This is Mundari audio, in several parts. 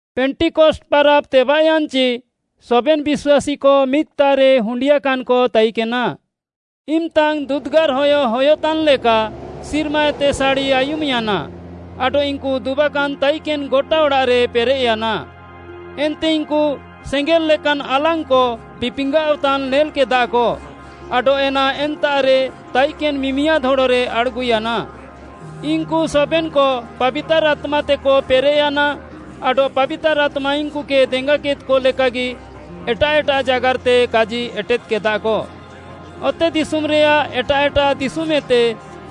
ପେଣ୍ଟିକଷ୍ଟ୍‌ ପାରାବ୍‌ ତେବାଃୟାନ୍‌ଚି, ସବେନ୍‌ ବିଶ୍ୱାସୀକ ମିଦ୍‌ତାଃରେ ହୁଣ୍ଡିଆକାନ୍‍କ ତାଇକେନା। ଇମ୍‌ତାଙ୍ଗ୍‌ ଦୁଦ୍‌ଗାର୍‌ ହୟ ହୟତାନ୍‍ଲେକା ସିର୍ମାଏତେ ସାଡ଼ି ଆୟୁମ୍‌ୟାନା ଆଡଃ ଇନ୍‌କୁ ଦୁବାକାନ୍‌ ତାଇକେନ୍‌ ଗଟା ଅଡ଼ାଃରେ ପେରେଃୟାନା। ଏନ୍ତେ ଇନ୍‌କୁ ସେଙ୍ଗେଲ୍‍ ଲେକାନ୍ ଆଲାଙ୍ଗ୍‌କ ବିପିଙ୍ଗାଅଃତାନ୍ ନେଲ୍‌କେଦାକ ଆଡଃ ଏନା ଏନ୍ତାଃରେ ତାଇକେନ୍‌ ମିମିଆଦ୍‌ ହଡ଼ରେ ଆଡ଼୍‌ଗୁୟାନା। ଇନ୍‌କୁ ସବେନ୍‌କ ପାବିତାର୍‌ ଆତ୍ମାତେକ ପେରେଃୟାନା ଆଡଃ ପାବିତାର୍‌ ଆତ୍ମା ଇନ୍‌କୁକେ ଦେଙ୍ଗାକେଦ୍‌କ ଲେକାଗି ଏଟାଃ ଏଟାଃ ଜାଗାର୍‌ତେ କାଜି ଏଟେଦ୍‌କେଦାକ। ଅତେଦିଶୁମ୍‌ରେୟାଃ ଏଟାଃ ଏଟାଃ ଦିଶୁମ୍‌ଏତେ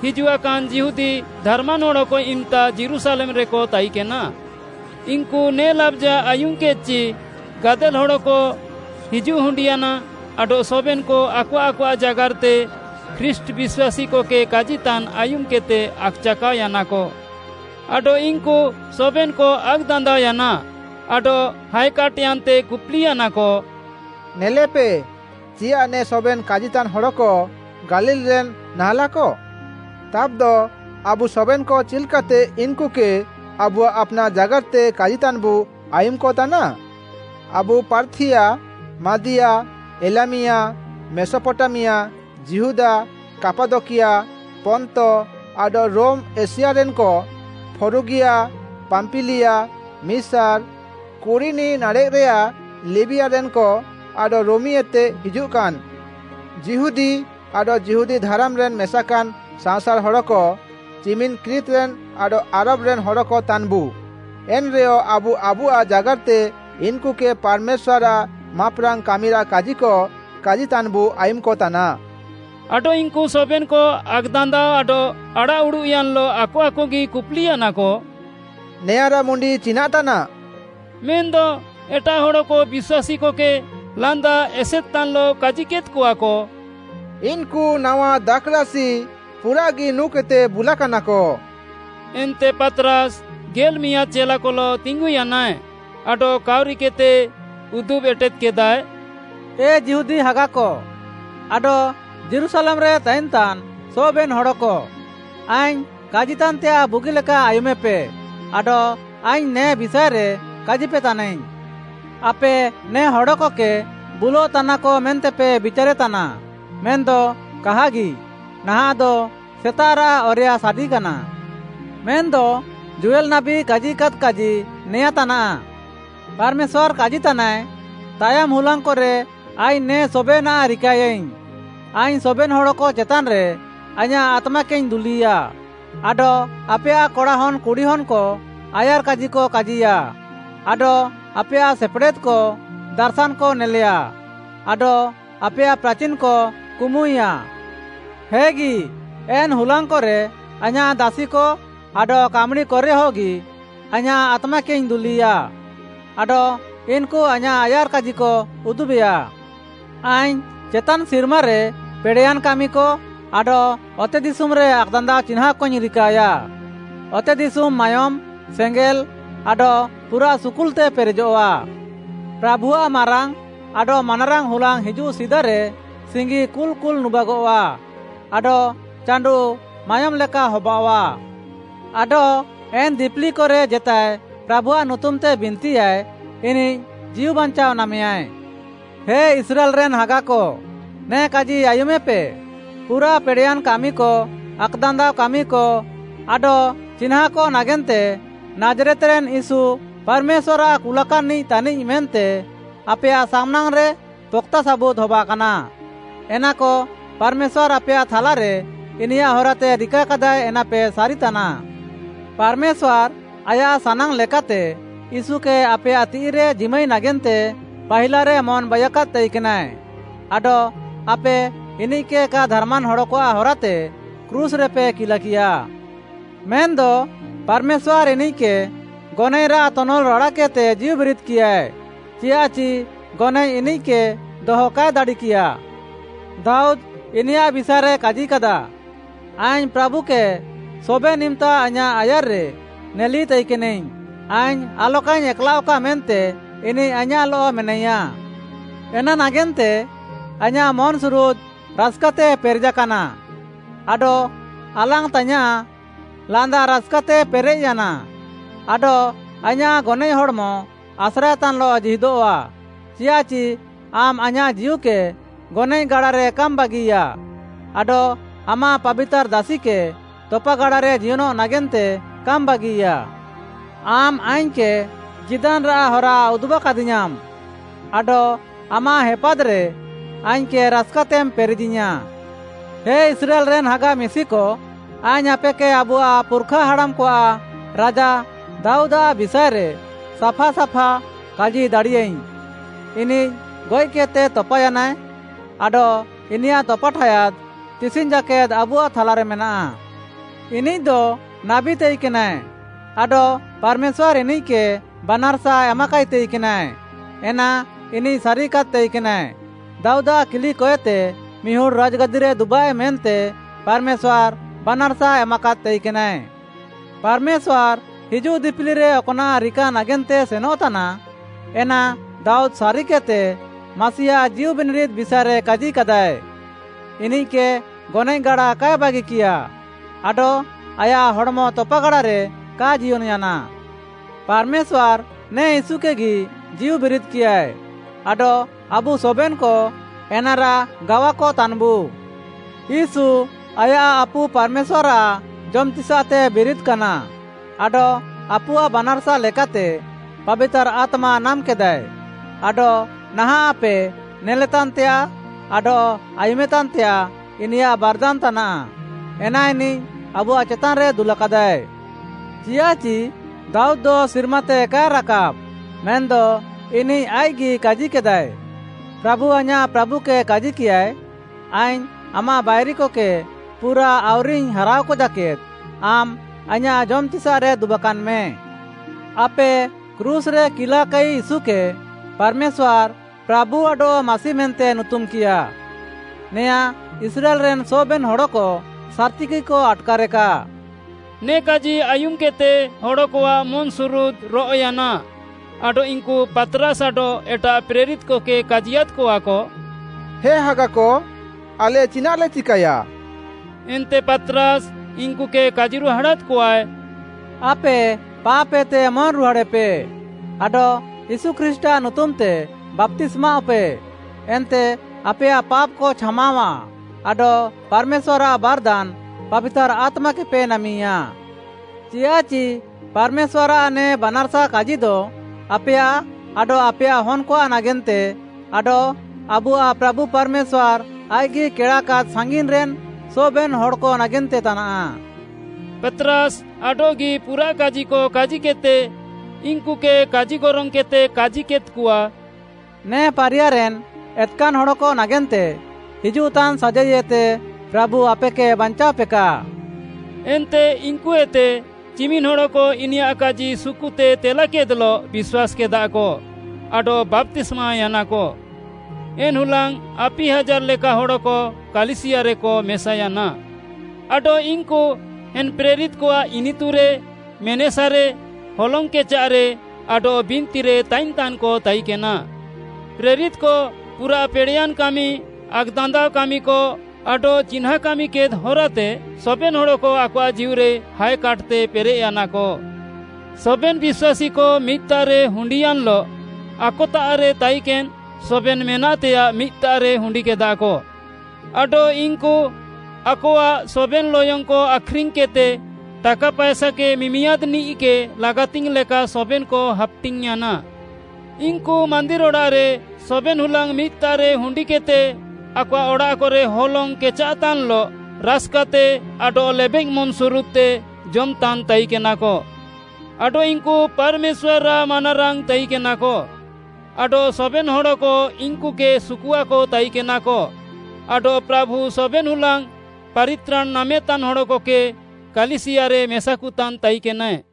ହିଜୁଆକାନ୍‍ ଯିହୁଦୀ ଧାରାମାନ୍‌ ହଡ଼କ ଇମ୍‌ତା ଯୀରୁଶାଲେମ୍‌ରେକ ତାଇକେନା। ଇନ୍‌କୁ ନେ ଲାବ୍‌ଜା ଆୟୁମ୍‌କେଦ୍‌ଚି, ଗାଦେଲ୍‌ ହଡ଼କ ହିଜୁଃ ହୁଣ୍ଡିୟାନା ଆଡଃ ସବେନ୍‌କ ଆକଆଃ ଆକଆଃ ଜାଗାର୍‌ତେ ଖ୍ରୀଷ୍ଟ୍‌ ବିଶ୍ୱାସୀକକେ କାଜିତାନ୍‌ ଆୟୁମ୍‌କେଦ୍‌ତେ ଆକ୍‌ଚାକାଅୟାନାକ। ଆଡଃ ଇନ୍‌କୁ ସବେନ୍‌କ ଆକ୍‌ଦାନ୍ଦାଅୟାନା ଆଡଃ ହାଏକାଟ୍‍ୟାନ୍ତେ କୁପୁଲିୟାନାକ, “ନେଲେପେ, ଚିୟାଃ ନେ ସବେନ୍‌ କାଜିତାନ୍‍ ହଡ଼କ ଗାଲିଲ୍‌ରେନ୍‌ ନାହାଁଲାକ? ତାବ୍‌ଦ ଆବୁ ସବେନ୍‌କ ଚିଲ୍‍କାତେ ଇନ୍‌କୁକେ ଆବୁଆଃ ଆପ୍‌ନାଃ ଜାଗାର୍‌ତେ କାଜିତାନ୍‌ବୁ ଆୟୁମ୍‌କତାନା? ଆବୁ ପାର୍ଥିୟା, ମାଦିୟା, ଏଲାମିୟା, ମେସପଟାମିଆ, ଯିହୁଦା, କାପାଦକିଆ, ପନ୍ତ, ଆଡଃ ରୋମ୍‌ ଏସିଆରେନ୍‍କ, ଫ୍ରୁଗିଆ, ପାମ୍ପିଲିଆ, ମିସାର୍‌, କୁରିନି ନାଡ଼େଃରେଆଃ ଲିବିୟାରେନ୍‍କ ଆଡଃ ରୋମିଏତେ ହିଜୁଃକାନ୍ ଯିହୁଦୀ ଆଡଃ ଯିହୁଦୀ ଧାରାମ୍‌ରେ ମେସାକାନ୍‌ ସାଅଁସାର୍‌ ହଡ଼କ, ଚିମିନ୍‌ କ୍ରିତ୍‌ରେନ୍‌ ଆଡଃ ଆରାବ୍‌ରେନ୍‍ ହଡ଼କ ତାନ୍‌ବୁ, ଏନ୍‌ରେୟ ଆବୁ ଆବୁଆଃ ଜାଗାର୍‌ତେ ଇନ୍‌କୁକେ ପାର୍‌ମେଶ୍ୱାର୍‌ଆଃ ମାପ୍‌ରାଙ୍ଗ୍‌ କାମିରାଃ କାଜିକ କାଜିତାନ୍‌ବୁ ଆୟୁମ୍‌କତାନା।” ଆଡଃ ଇନ୍‌କୁ ସବେନ୍‌କ ଆକ୍‌ଦାନ୍ଦାଅ ଆଡଃ ଆଡ଼ାଃଉଡ଼ୁଃୟାନ୍‌ଲଃ ଆକ ଆକଗି କୁପ୍‌ଲିୟାନାକ, “ନେଆଁରାଃ ମୁଣ୍ଡି ଚିନାଃ ତାନାଃ?” ମେନ୍‌ଦ ଏଟାଃ ହଡ଼କ ବିଶ୍ୱାସୀକକେ ଲାନ୍ଦା ଏସେଦ୍‌ତାନ୍‌ଲଃ କାଜିକେଦ୍‌କଆକ, “ଇନ୍‌କୁ ନାୱା ଦାଖ୍‌ରାସି ପୁରାଃଗି ନୁଁକେଦ୍‌ତେ ବୁଲାକାନାକ।” ଏନ୍ତେ ପାତ୍‌ରାସ୍‌ ଗେଲ୍‌ମିଆଁଦ୍‌ ଚେଲାକଲଃ ତିଙ୍ଗୁୟାନାଏ ଆଡଃ କାଉରିକେଦ୍‌ତେ ଉଦୁବ୍‌ ଏଟେଦ୍‌କେଦାଏ, “ଏ ଯିହୁଦୀ ହାଗାକ, ଆଡଃ ଯୀରୁଶାଲେମ୍‌ରେ ତାଇନ୍‍ତାନ୍‍ ସବେନ୍‌ ହଡ଼କ, ଆଇଙ୍ଗ୍‌ କାଜିତାନ୍‌ତେୟାଃ ବୁଗିଲେକା ଆୟୁମେପେ ଆଡଃ ଆଇଙ୍ଗ୍‌ ନେ ବିଷାଏରେ କାଜିପେତାନାଇଙ୍ଗ୍‌। ଆପେ ନେ ହଡ଼କକେ ବୁଲଃତାନାକ ମେନ୍ତେପେ ବିଚାରେତାନା, ମେନ୍‌ଦ କାହାଗି, ନାହାଁଃଦ ସେତାଃରାଃ ଅରେୟା ସାଡିକାନା। ମେନ୍‌ଦ ଯୋଏଲ୍‌ ନାବୀ କାଜିକାଦ୍‌ କାଜି ନେଆଁଁ ତାନାଃ: “ପାର୍‌ମେଶ୍ୱାର୍‌ କାଜିତାନାଏ, ‘ତାୟମ୍ ହୁଲାଙ୍ଗ୍‌କରେ ଆଇଙ୍ଗ୍‌ ନେ ସବେନାଃ ରିକାଏୟାଇଙ୍ଗ୍‌, ଆଇଙ୍ଗ୍‌ ସବେନ୍‌ ହଡ଼କ ଚେତାନ୍‌ରେ ଆଇଁୟାଃ ଆତ୍ମାକେଇଙ୍ଗ୍‌ ଦୁଲିୟା ଆଡଃ ଆପେୟାଃ କଡ଼ାହନ୍‌ କୁଡ଼ିହନ୍‌କ ଆୟାର୍‌କାଜିକ କାଜିୟା, ଆଡଃ ଆପେୟାଃ ସେପେଡ଼େଦ୍‍କ ଦାର୍‌ଶାନ୍‌କ ନେଲେୟା, ଆଡଃ ଆପେୟାଃ ପ୍ରାଚିନ୍‌କ କୁମୁୟାଁ। ହେଗି, ଏନ୍‌ ହୁଲାଙ୍ଗ୍‌କରେ ଆଇଁୟାଃ ଦାସିକ ଆଡଃ କାମ୍‌ଡ଼ିକରେହଗି, ଆଇଁୟାଃ ଆତ୍ମାକେଇଙ୍ଗ୍‌ ଦୁଲିୟା, ଆଡଃ ଇନ୍‌କୁ ଆଇଁୟାଃ ଆୟାର୍‌କାଜିକ ଉଦୁବେୟା। ଆଇଙ୍ଗ୍‌ ଚେତାନ୍‌ ସିର୍ମାରେ ପେଡ଼େୟାନ୍‌ କାମିକ ଆଡଃ ଅତେଦିଶୁମ୍‌ରେ ଆକ୍‌ଦାନ୍ଦାଅ ଚିହ୍ନାଁଁକଇଙ୍ଗ୍‌ ରିକାୟା। ଅତେଦିଶୁମ୍‌ ମାୟୋମ୍‌, ସେଙ୍ଗେଲ୍ ଆଡଃ ପୁରାଃ ସୁକୁଲ୍‌ତେ ପେରେଜଃଆ; ପ୍ରାଭୁଆଃ ମାରାଙ୍ଗ୍‌ ଆଡଃ ମାନାରାଙ୍ଗ୍‌ ହୁଲାଙ୍ଗ୍‌ ହିଜୁଃ ସିଦାରେ ସିଙ୍ଗି କୁଲ୍‌କୁଲ୍‌ ନୁବାଗଃଆ, ଆଡଃ ଚାଣ୍ଡୁଃ ମାୟୋମ୍‌ ଲେକା ହବାଅଃଆ। ଆଡଃ ଏନ୍‌ ଦିପିଲିକରେ ଜେତାଏ ପ୍ରାଭୁଆଃ ନୁତୁମ୍‌ତେ ବିନ୍ତିୟାଏ, ଇନିଃ ଜୀଉ ବାଞ୍ଚାଅ ନାମେୟାଏ।’ “ହେ ଇସ୍ରାଏଲ୍‌ରେନ୍‌ ହାଗାକ, ନେ କାଜି ଆୟୁମେପେ, ପୁରାଃ ପେଡ଼େୟାନ୍ କାମିକ, ଆକ୍‌ଦାନ୍ଦାଅ କାମିକ ଆଡଃ ଚିହ୍ନାଁକ ନାଗେନ୍ତେ ନାଜ୍‌ରେତ୍‌ରେନ୍‌ ୟୀଶୁ ପାର୍‌ମେଶ୍ୱାର୍‌ଆଃ କୁଲାକାନ୍‌ନିଃ ତାନିଃ ମେନ୍ତେ ଆପେୟାଃ ସାମ୍‌ନାଙ୍ଗ୍‌ରେ ପକ୍‌ତା ସାବୁଦ୍‌ ହବାକାନା। ଏନାକ ପାର୍‌ମେଶ୍ୱାର୍‌ ଆପେୟାଃ ଥାଲାରେ ଇନିୟାଃ ହରାତେ ରିକାକାଦାଏ ଏନାପେ ସାରିତାନା। ପାର୍‌ମେଶ୍ୱାର୍‌ ଆୟାଃ ସାନାଙ୍ଗ୍‌ ଲେକାତେ ୟୀଶୁକେ ଆପେୟାଃ ତିଃଇରେ ଜିମାଇ ନାଗେନ୍ତେ ପାହିଲାରେ ମନ୍‌ ବାଇୟାକାଦ୍‌ ତାଇକେନାଏ ଆଡଃ ଆପେ ଇନିଃକେ କା ଧାର୍‌ମାନ୍‌ ହଡ଼କଆଃ ହରାତେ କ୍ରୁଶ୍‌ରେପେ କିଲାକିୟା। ମେନ୍‌ଦ ପାର୍‌ମେଶ୍ୱାର୍‌ ଇନିଃକେ ଗନଏଃରାଃ ତନଲ୍ ରାଡ଼ାକେଦ୍‌ତେ ଜୀଉବିରିଦ୍‌କିୟାଏ, ଚିୟାଃଚି ଗନଏଃ ଇନିଃକେ ଦହ କାଏ ଦାଡ଼ିକିୟା। ଦାଉଦ୍‌ ଇନିୟାଃ ବିଷାଏରେ କାଜିକାଦାଏ, “‘ଆଇଙ୍ଗ୍‌ ପ୍ରାଭୁକେ ସବେନ୍‌ ଇମ୍‌ତା ଆଇଁୟାଃ ଆୟାର୍‌ରେ ନେଲି ତାଇକେନାଇଙ୍ଗ୍‌, ଆଇଙ୍ଗ୍‌ ଆଲକାଇଙ୍ଗ୍‌ ଏକ୍‌ଲାଅଃକା ମେନ୍ତେ ଇନିଃ ଆଇଁୟାଃଲଃ ମେନାଇୟା। ଏନା ନାଗେନ୍ତେ ଆଇଁୟାଃ ମନ୍‌ସୁରୁଦ୍‌ ରାସ୍‌କାତେ ପେରେଜାକାନା, ଆଡଃ ଆଲାଙ୍ଗ୍‌ତାଇୟାଁଃ ଲାନ୍ଦା ରାସ୍‌କାତେ ପେରେଃୟାନା। ଆଡଃ ଆଇଁୟାଃ ଗନଏଃ ହଡ଼୍‌ମ ଆସ୍ରାଏତାନ୍‍ଲଃ ଜୀହିଦଃଆ, ଚିୟାଃଚି ଆମ୍‌ ଆଇଁୟାଃ ଜୀଉକେ ଗନଏଃଗାଡ଼ାରେ କାମ୍‌ ବାଗିୟା, ଆଡଃ ଆମାଃ ପାବିତାର୍‌ ଦାସିକେ ତପାଗାଡ଼ାରେ ଜିୟନଃ ନାଗେନ୍ତେ କାମ୍‌ ବାଗିୟା। ଆମ୍‌ ଆଇଙ୍ଗ୍‌କେ ଜୀଦାନ୍‌ରାଃ ହରା ଉଦୁବାକାଦିୟାଁମ୍‌, ଆଡଃ ଆମାଃ ହେପାଦ୍‌ରେ ଆଇଙ୍ଗ୍‌କେ ରାସ୍‌କାତେମ୍‌ ପେରେଜିୟାଁ।’ “ହେ ଇସ୍ରାଏଲ୍‌ରେନ୍‌ ହାଗା ମିଶିକ, ଆଇଙ୍ଗ୍‌ ଆପେକେ ଆବୁଆଃ ପୁର୍‌ଖାହାଡ଼ାମ୍‌କଆଃ ରାଜା ଦାଉଦ୍‌ଆଃ ବିଷାଏରେ ସାଫାସାଫା କାଜି ଦାଡ଼ିୟାଇଙ୍ଗ୍‌। ଇନିଃ ଗଏଃକେଦ୍‌ତେ ତପାୟାନାଏ ଆଡଃ ଇନିୟାଃ ତପାଠାୟାଦ୍ ତିସିଙ୍ଗ୍‌ ଜାକେଦ୍‌ ଆବୁଆଃ ଥାଲାରେମେନାଃ। ଇନିଃଦ ନାବୀ ତାଇକେନାଏ ଆଡଃ ପାର୍‌ମେଶ୍ୱାର୍‌ ଇନିଃକେ ବାନାର୍‌ସା ଏମାକାଇ ତାଇକେନାଏ, ଏନା ଇନିଃ ସାରିକାଦ୍‌ ତାଇକେନାଏ। ଦାଉଦାଃ କିଲିକଏତେ ମିହୁଡ଼୍‌ ରାଜ୍‌ଗାଦିରେ ଦୁବାଏ ମେନ୍ତେ ପାର୍‌ମେଶ୍ୱାର୍‌ ବାନାର୍‌ସା ଏମାକାଦ୍‌ ତାଇକେନାଏ। ପାର୍‌ମେଶ୍ୱାର୍‌ ହିଜୁଃ ଦିପିଲିରେ ଅକ୍‌ନାଃ ରିକା ନାଗେନ୍ତେ ସେନଃତାନା, ଏନା ଦାଉଦ୍‌ ସାରିକେଦ୍‌ତେ, ମାସିଆଃ ଜୀଉବିନିରିଦ୍‌ ବିଷାଏରେ କାଜିକାଦାଏ, “‘ଇନିଃକେ ଗନଏଃଗାଡ଼ା କାଏ ବାଗିକିୟା, ଆଡଃ ଆୟାଃ ହଡ଼୍‌ମ ତପାଗାଡ଼ାରେ କା ଜିୟନ୍‌ୟାନା।’ ପାର୍‌ମେଶ୍ୱାର୍‌ ନେ ୟୀଶୁକେଗି ଜୀଉବିରିଦ୍‍କିୟାଏ ଆଡଃ ଆବୁ ସବେନ୍‌କ ଏନାରାଃ ଗାୱାକତାନ୍‍ବୁ। ୟୀଶୁ ଆୟାଃ ଆପୁ ପାର୍‌ମେଶ୍ୱାର୍‌ଆଃ ଜମ୍‌ତିସାଃତେ ବିରିଦ୍‌କାନା ଆଡଃ ଆପୁଆଃ ବାନାର୍‌ସା ଲେକାତେ ପାବିତାର୍‌ ଆତ୍ମା ନାମ୍‍କେଦାଏ, ଆଡଃ ନାହାଁଃ ଆପେ ନେଲେତାନ୍‌ତେୟାଃ ଆଡଃ ଆୟୁମେତାନ୍‌ତେୟାଃ ଇନିୟାଃ ବାର୍‌ଦାନ୍‌ ତାନାଃ। ଏନା ଇନିଃ ଆବୁଆଃ ଚେତାନ୍‌ରେ ଦୁଲାକାଦାଏ। ଚିୟାଃଚି ଦାଉଦ୍‌ଦ ସିର୍ମାତେ କାଏ ରାକାବ୍‌ ମେନ୍‌ଦ ଇନିଃ ଆଇଃକ୍‌ଗି କାଜିକେଦାଏ, ‘ପ୍ରାଭୁ ଆଇଁୟାଃ ପ୍ରାଭୁକେ କାଜିକିୟାଏ, ଆଇଙ୍ଗ୍‌ ଆମାଃ ବାଇରିକକେ ପୁରା ଆଉରିଙ୍ଗ୍‌ ହାରାଅକ ଜାକେଦ୍‌ ଆମ୍‌ ଆଇଁୟାଃ ଜମ୍‍ତିସାଃରେ ଦୁବାକାନ୍‍ମେ।’ “ଆପେ କ୍ରୁଶ୍‌ରେ କିଲାକାଇ ୟୀଶୁକେ, ପାର୍‌ମେଶ୍ୱାର୍‌, ପ୍ରାଭୁ ଆଡଃ ମାସି ମେନ୍ତେ ନୁତୁମ୍‍କିୟାଏ, ନେଆଁଁ ଇସ୍ରାଏଲ୍‌ରେନ୍‌ ସବେନ୍‌ ହଡ଼କ ସାର୍‍ତିଗିକ ଆଟ୍‌କାରେକା।” ନେ କାଜି ଆୟୁମ୍‌କେଦ୍‌ତେ ହଡ଼କଆଃ ମନ୍‌ସୁରୁଦ୍‌ ରଅଃୟାନା ଆଡଃ ଇନ୍‌କୁ ପାତ୍‌ରାସ୍‌ ଆଡଃ ଏଟାଃ ପ୍ରେରିତ୍‌କକେ କାଜିୟାଦ୍‍କଆକ, “ହେ ହାଗାକ, ଆଲେ ଚିନାଃଲେ ଚିକାୟା?” ଏନ୍ତେ ପାତ୍‌ରାସ୍‌ ଇନ୍‌କୁକେ କାଜିରୁହାଡ଼ାଦ୍‌କଆଏ, “ଆପେ ପାପ୍‍ ଏତେ ମନ୍‌ରୁହାଡ଼େପେ ଆଡଃ ୟୀଶୁ ଖ୍ରୀଷ୍ଟ୍‌ଆଃ ନୁତୁମ୍‌ତେ ବାପ୍ତିସ୍ମାଅଃପେ, ଏନ୍ତେ ଆପେୟାଃ ପାପ୍‌କ ଛାମାଅଃଆ ଆଡଃ ପାର୍‌ମେଶ୍ୱାର୍‌ଆଃ ବାର୍‌ଦାନ୍‌, ପାବିତାର୍‌ ଆତ୍ମାକେପେ ନାମିୟା। ଚିୟାଃଚି ପାର୍‌ମେଶ୍ୱାର୍‌ଆଃ ନେ ବାନାର୍‌ସା କାଜିଦ ଆପେୟାଃ ଆଡଃ ଆପେୟାଃ ହନ୍‌କଆଃ ନାଗେନ୍ତେ, ଆଡଃ ଆବୁଆଃ ପ୍ରାଭୁ ପାର୍‌ମେଶ୍ୱାର୍‌ ଆଇଃକ୍‌ଗି କେଡ଼ାକାଦ୍‌ ସାଙ୍ଗିନ୍‍ରେନ୍ ସବେନ୍‌ ହଡ଼କ ନାଗେନ୍ତେ ତାନାଃ।” ପାତ୍‌ରାସ୍‌ ଆଡଃଗି ପୁରାଃ କାଜିକ କାଜିକେଦ୍‌ତେ ଇନ୍‌କୁକେ କାଜିଗରଙ୍ଗ୍‌କେଦ୍‌ତେ କାଜିକେଦ୍‌କଆ, “ନେ ପାରିୟାରେନ୍‌ ଏତ୍‌କାନ୍‌ ହଡ଼କ ନାଗେନ୍ତେ ହିଜୁଃତାନ୍‌ ସାଜାଇଏତେ ପ୍ରାଭୁ ଆପେକେ ବାଞ୍ଚାଅପେକା।” ଏନ୍ତେ ଇନ୍‌କୁଏତେ ଚିମିନ୍‌ ହଡ଼କ ଇନିୟାଃ କାଜି ସୁକୁତେ ତେଲାକେଦ୍‍ଲଃ ବିଶ୍ୱାସ୍‌କେଦାକ ଆଡଃ ବାପ୍ତିସ୍ମାୟାନାକ। ଏନ୍‌ ହୁଲାଙ୍ଗ୍‌ ଆପି ହାଜାର୍‌ ଲେକା ହଡ଼କ କାଲିସିୟାରେକ ମେସାୟାନା। ଆଡଃ ଇନ୍‌କୁ ଏନ୍‌ ପ୍ରେରିତ୍‌କଆଃ ଇନିତୁରେ, ମେନେସାରେ, ହଲଙ୍ଗ୍‌ କେଚାଃରେ ଆଡଃ ବିନ୍ତିରେ ତାଇନ୍‍ତାନ୍‌କ ତାଇକେନା। ପ୍ରେରିତ୍‌କ ପୁରାଃ ପେଡ଼େୟାନ୍‍କାମି, ଆକ୍‌ଦାନ୍ଦାଅ କାମିକ, ଆଡଃ ଚିହ୍ନାଁ କାମିକେଦ୍‌ ହରାତେ ସବେନ୍‌ ହଡ଼କ ଆକଆଃ ଜୀଉରେ ହାଏକାଟ୍‌ତେ ପେରେଃୟାନାକ। ସବେନ୍‌ ବିଶ୍ୱାସୀକ ମିଦ୍‌ତାଃରେ ହୁଣ୍ଡିୟାନ୍‌ଲଃ ଆକତାଃରେ ତାଇକେନ୍‌ ସବେନ୍‌ ମେନାଃତେୟାଃ ମିଦ୍‌ତାଃରେ ହୁଣ୍ଡିକେଦାକ। ଆଡଃ ଇନ୍‌କୁ ଆକଆଃ ସବେନ୍‌ ଲୟଙ୍ଗ୍‌କ ଆଖ୍‌ରିଙ୍ଗ୍‌କେଦ୍‌ତେ ଟାକା ପାଏସାକେ ମିମିଆଦ୍‌‌ନିଃକେ ଲାଗାତିଙ୍ଗ୍‌ ଲେକା ସବେନ୍‌କ ହାପ୍‍ଟିଙ୍ଗ୍‌ୟାନା। ଇନ୍‌କୁ ମାନ୍ଦିର୍‌ଅଡ଼ାଃରେ ସବେନ୍‌ହୁଲାଙ୍ଗ୍‌ ମିଦ୍‍ତାଃରେ ହୁଣ୍ଡିକେଦ୍‌ତେ ଆକଆଃ ଅଡ଼ାଃକରେ ହଲଙ୍ଗ୍‌ କେଚାଃତାନ୍‌ଲଃ ରାସ୍‌କାତେ ଆଡଃ ଲେବେଃ ମନ୍‌ସୁରୁଦ୍‌ତେ ଜମ୍‍ତାନ୍‍ ତାଇକେନାକ। ଆଡଃ ଇନ୍‌କୁ ପାର୍‌ମେଶ୍ୱାର୍‌ଆଃ ମାନାରାଙ୍ଗ୍‌ ତାଇକେନାକ ଆଡଃ ସବେନ୍‌ ହଡ଼କ ଇନ୍‌କୁକେ ସୁକୁଆକ ତାଇକେନାକ। ଆଡଃ ପ୍ରାଭୁ ସବେନ୍‌ ହୁଲାଙ୍ଗ୍‌ ପାରିତ୍ରାଣ୍‌ ନାମେତାନ୍‌ ହଡ଼କକେ କାଲିସିୟାରେ ମେସାକୁତାନ୍ ତାଇକେନାଏ।